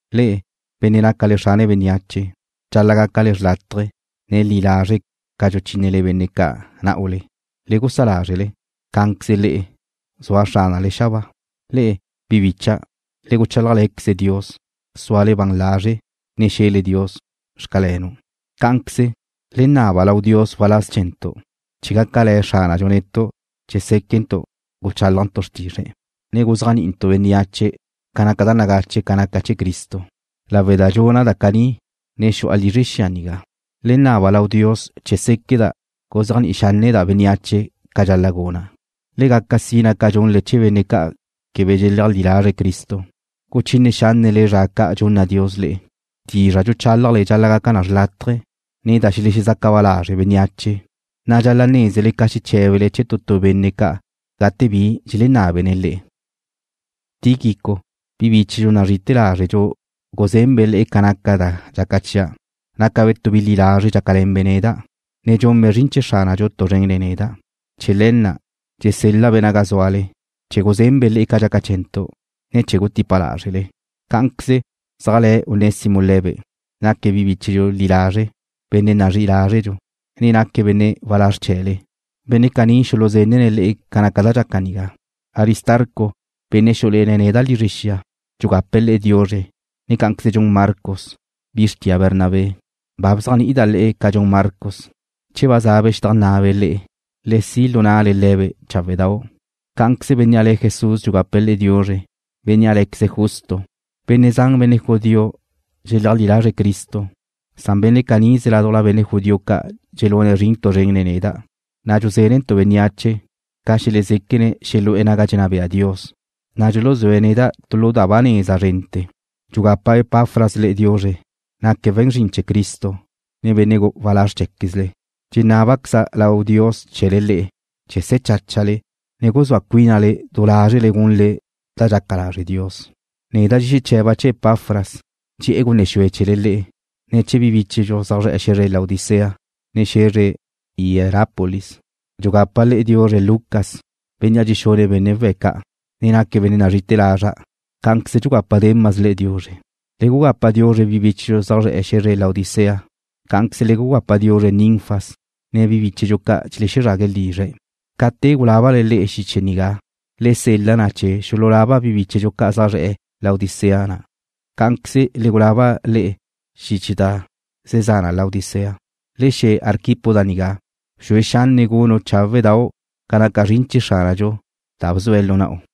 Le'e, benne' nácale xrane bénneache, dxal-la' gácale xlátaje̱, ne li lazre' ca dxuchínele benne' ca' ná'ule. Le gusá lázrele, cá'anqueze le'e, zua Xránale xabáa. Le'e, bi bícha'dau', le guchálajle̱queze Dios, súale ban lazre', ne xe̱le Dios: Xcalenu'. Cá'anqueze, le naba lau Dios waláz chee̱ntu', chee̱ gácale̱ Xránadxu netu' chee̱ séquentu' guchálajntu' xrtizre̱', ne guzéajni'intu' bénneache ca naca da nagache ca naca chee̱ Cristo. Lawe' da dxuna' da caní ne xu'a lizre xia nigá. Le naba lau Dios chee̱ séqueda' guzéajni'i xánneda' bénneache ca dxal-la' guna'. Le gaca sina ca dxunle chee̱ benne' ca' quebe dxeleajlí lazre̱' Cristo, guchine xánnele zra ca' dxunna Dios le'e. Dizra' dxuchálajle dxal-la' gaca na xrlátaje, ne da xelexezaca ba lazre' bénneache, na' dxal-la' nézele ca xeché̱bele chee̱ tu tu benne' ca' gate bi dxelenábene̱' le'e. Tíquico, bi bíchedxu nazrí'i lázredxu guzenbe' le'e ca naca da dxaca chia'. Nácabe' tu bi li lazre' dxácale̱nbe' neda', ne dxunbe' zrin chee̱ Xránadxu tu zren nen neda'. Chee̱ le̱ na', dxusel-la'-be' naga zúale, chee̱ guzenbe' le'e ca dxaca chee̱ntu', ne chee̱ gutípabe' lázrele. Cá'anqueze zéajle̱ Onésimo le̱be', naque̱' bíchedxu li lazre', benne' nazrí'i lázredxu, ne naque̱' benne' walázr chee̱le. Benne' caní xuluzenne̱' le'e ca naca da dxaca nigá. Aristarco, benne' xú'ule̱ne̱' neda' lizre xia, dxugape̱' le'e diuzre, ne cá'anqueze dxun Marcos, bi xrtia Bernabé. Ba bzéajni'ida' le'e ca dxun Marcos. Che waza'be' xedajnná'abe' le'e, le si' lu na'le le̱be' cháwe'dau'. Cá'anqueze bénnea' le̱' Jesús dxugape̱' le'e diuzre, bénnea' lé̱queze̱' Justo. Benne' zan benne' judío dxeleajlí lazre̱' Cristo, san benne' canize ládujla benne' judío ca' dxelune̱' zrin tu zren nen neda', na' dxuzénentu' bénneache ca xelezéquene̱' xelu'e̱ naga dxenná bea Dios, na' dxuluzúe̱' neda' tu lu da ba neza zrente̱. Dxugapa Epafras le'e diuzre. Naque̱' we̱n zrin chee̱ Cristo, ne benne' walázr chee̱quezle. Dxenábaqueze̱' lau Dios chee̱le le'e chee̱ se̱ cháchale, ne guzúa cuínale du lázrele chee̱ gunle da dxaca lazre' Dios. Neda' dxexeche̱ba' chee̱ Epafras, dxe'e̱ gunne xue chee̱le le'e, ne chee̱ bi bíchedxu zaj zre̱'e̱ xe̱zre Laodicea, ne xe̱zre Hierápolis. Dxugapa le'e diuzre Lucas, bénnea' dxexune̱' benne' we̱' ca', ne naque̱' benne' nazrí'i lazra'. Cá'anqueze dxugapa Demas le'e diuzre. Le gugapa diuzre bi bíchedxu zaj zre̱'e̱ xe̱zre Laodicea. Cá'anqueze le gugapa diuzre Ninfas, ne bi bíchedxu ca' dxelezrague̱' lizre̱'. Ca te gulábale le'e xiche nigá, le sel-la na chee̱ xululaba bi bíchedxu ca' zaj zre̱'e̱ Laodicea na. Cá'anqueze le gulaba le'e xiche da ze za na Laodicea. Le xe̱ Arquipo da nigá: Bxue xanne' gunu' cháwe'dau' ca naca zrin chee̱ Xránadxu da bzue̱' lu na'u.